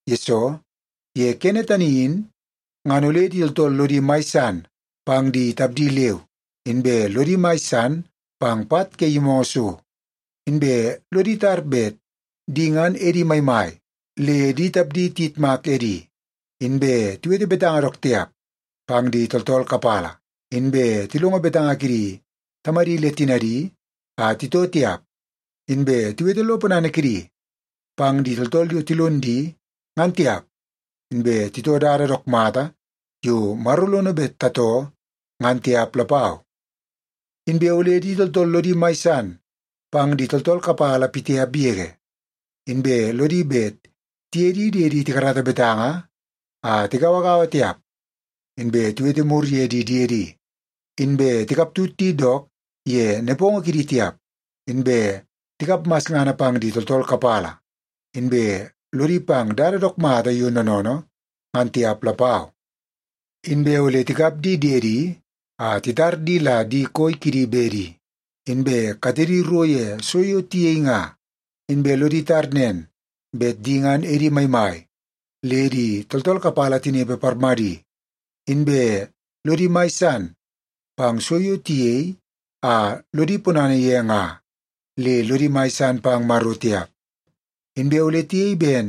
Yesoo, ye kene tani in ngan ole di tooltool lodi mai san pang di tapdi leu, inbe lodi mai san pang pat ke yimoongoo so, inbe lodi tar bet di ngan edi maimai le di tapdi tiyitmak edi, inbe tiwete betanga dook tiap pang di tooltool kapala, inbe tilongo betanga kidi tamadi le tinadi a titoo tiap, inbe tiwete lo ponana kidi pang di tooltool yo tilon di ngan tiap, inbe titoo dada dook mata yo Maro lono bet tatoo ngan tiap lapau. Inbe ole di tooltool lodi mai san pang di tooltool kapala pitiap yege, inbe lodi bet tiye di diedi tikarata betanga a tigauagaua tiap, inbe tiwete mur ye di diedi, inbe tikaptut di dook ye nepongo kidi tiap, inbe tikap masngana pang di tooltool kapala, inbe lodi pang dada dook mata yo noonoonoo ngan tiap lapau. Inbe ole tikap di diedi a titar di la di koi kidi bedi, inbe katedi ro ye so yo tiyei nga, inbe lodi tar nen bet di ngan edi maimai le tooltool kapala tinepe parmadi, inbe lodi mai san pang so yo tiyei a lodi ponana ye nga le lodi mai san pang Maro tiap. Inbe ole tiyei ben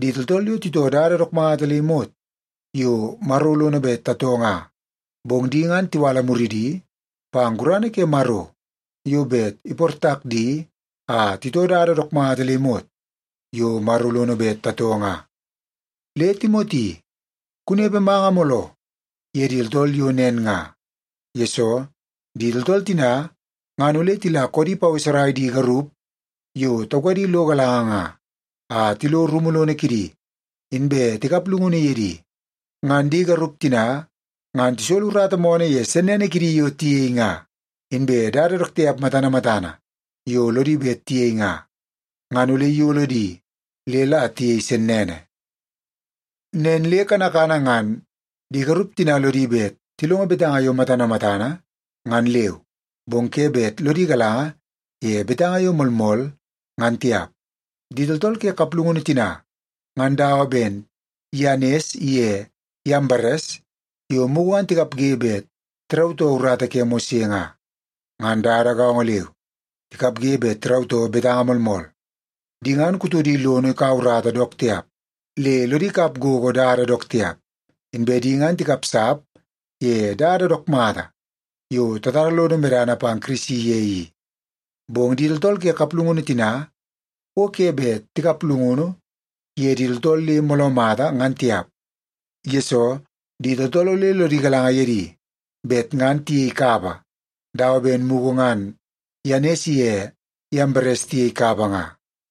di tooltool yo titoo dada dook mata le imot yo Maro lono bet tatoo nga, bong di ngan tiwala muridi pang gurana ke Maro yo bet iportak di a titoo dada dook mata le imot yo Maro lono bet tatoo nga. Le Timoti, kunepe manga mooloo ye di tooltool yo nen nga. Yesoo, di tooltool tina ngan ole tila koodi paweserai di garup yo taukadi lo galanga nga, a tilo rumu lono kidi, inbe tikap llungunu ye di. Ngan di garup tina ngan tisolo urata moonoo ye sennene kidi yo tiyei nga. Inbe dada dook tiap matana matana yo lodi bet tiyei nga, ngan ole iyolo di le la tiyei sennene. Nen le kanakana ngan di garup tina lodi bet tilongo betanga yo matana matana ngan leu, bong ke bet lodi galanga ye betanga yo moolmool ngan tiap. Di tooltool ke kaplungunu tina ngan dawa ben Yanes iye Yambares yo mugu ngan tikapge bet tirautoo urata ke Mose nga. Ngan dada gaongo leu, tikapge bet tirautoo betanga moolmool. Di ngan kutodi lono ikau urata dook tiap le lodi kap gogo dada dook tiap. Inbe di ngan tikapsap ye dada dook mata yo tatara lodo medana pang Kirisi ye i. Bong di tooltool ke kaplungunu tina o ke bet tikap llungunu ye di tooltool le mooloo mata ngan tiap, yesoo di tooltool ole lodi galanga ye di bet ngan tiyei kapa dawa ben mugu ngan Yanes iye Yambares tiyei kapa nga.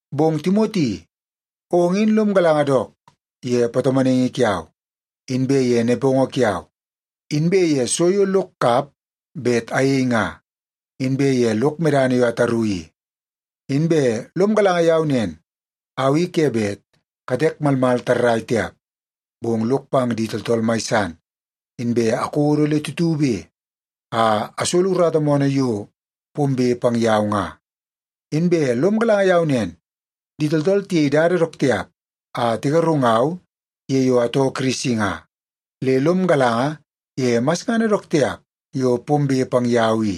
Bong Timoti, ong in lom galanga dook ye patomonaingi kiau, inbe ye nepongo kiau, inbe ye so yo lok kap bet ayei nga, inbe ye lok medana yo ataru i. Inbe lom galanga yau nen au i ke bet katek malmal tarrai tiap, bong lok pang di tooltool mai san, inbe akodo le tutube a asolo urata moonoo yo pombe pang yau nga. Inbe lom galanga yau nen, di tooltool tiyei dada dook tiap a tigarungau ye yo atoo Kirisi nga, le lom galanga ye masngana dook tiap yo pombe pang yau i.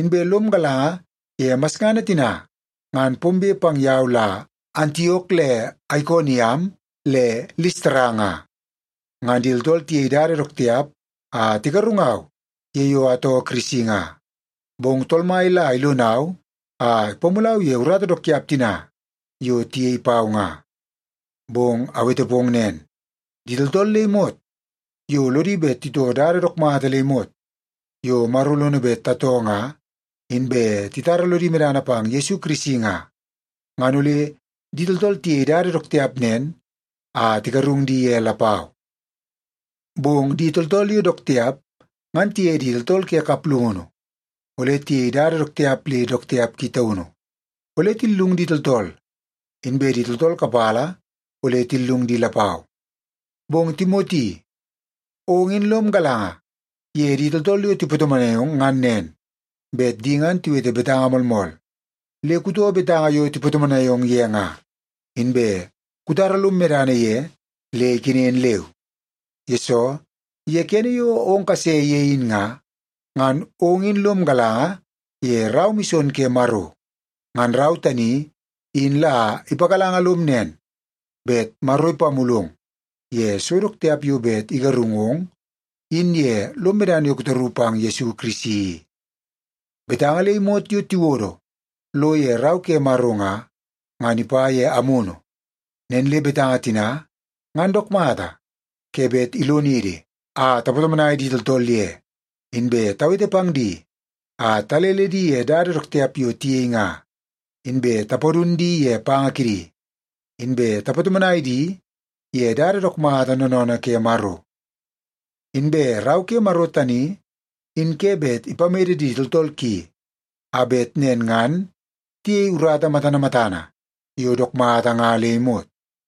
Inbe lom galanga ye masngana tina ngan pombe pang yau la Antiok le Aikoniam le Listara nga. Ngan di tooltool tiyei dada dook tiap a tigarungau ye yo atoo Kirisi nga, bong Tool Mai la ilonau a ipamulau ye urata dook tiap tina yo tiyei pau nga. Bong awete pong nen, di tooltool le imot yo lodi bet titoo dada dook mata le imot yo Maro lono bet tatoo nga, inbe titara lodi medana pang Yesu Kirisi nga, ngan ole di tooltool tiyei dada dook tiap nen a tigarung di ye lapau. Bong di tooltool yo dook tiap ngan tiye di tooltool ke kaplungunu ole tiyei dada dook tiap le dook tiap ki taunu. Ole tillung di tooltool, inbe di tooltool kapala ole tillung di lapau. Bong Timoti, ong in lom galanga ye di tooltool yo tipatomonai ong ngan nen, bet di ngan tiwete betanga moolmool. Le kutoo betanga yo tipatomonai ong ye nga, inbe kutara lom medana ye le ikenen leu. Yesoo, ye kene yo ong kase ye in nga, ngan ong in lom galanga ye rau mison ke Maro. Ngan rau tani in la ipagalanga lom nen bet Maro ipamulong ye so dook tiap yo bet igarungong in ye lom medana yo kutaru pang Yesu Kirisi i. Betanga le imot yo tiwodo lo ye Rau ke Maro nga, ngan ipa ye Amunu. Nen le betanga tina ngan dook mata ke bet ilonidi a tapatomonai di tooltool ye, inbe tawete pang di a talele di ye dada dook tiap yo tiyei nga, inbe tapadun di ye panga kidi, inbe tapatomonai di ye dada dook mata noonoonoo ke Maro. Inbe Rau ke Maro tani in ke bet ipamede di tooltool ki a bet nen ngan tiyei urata matana matana yo dook mata nga le imot.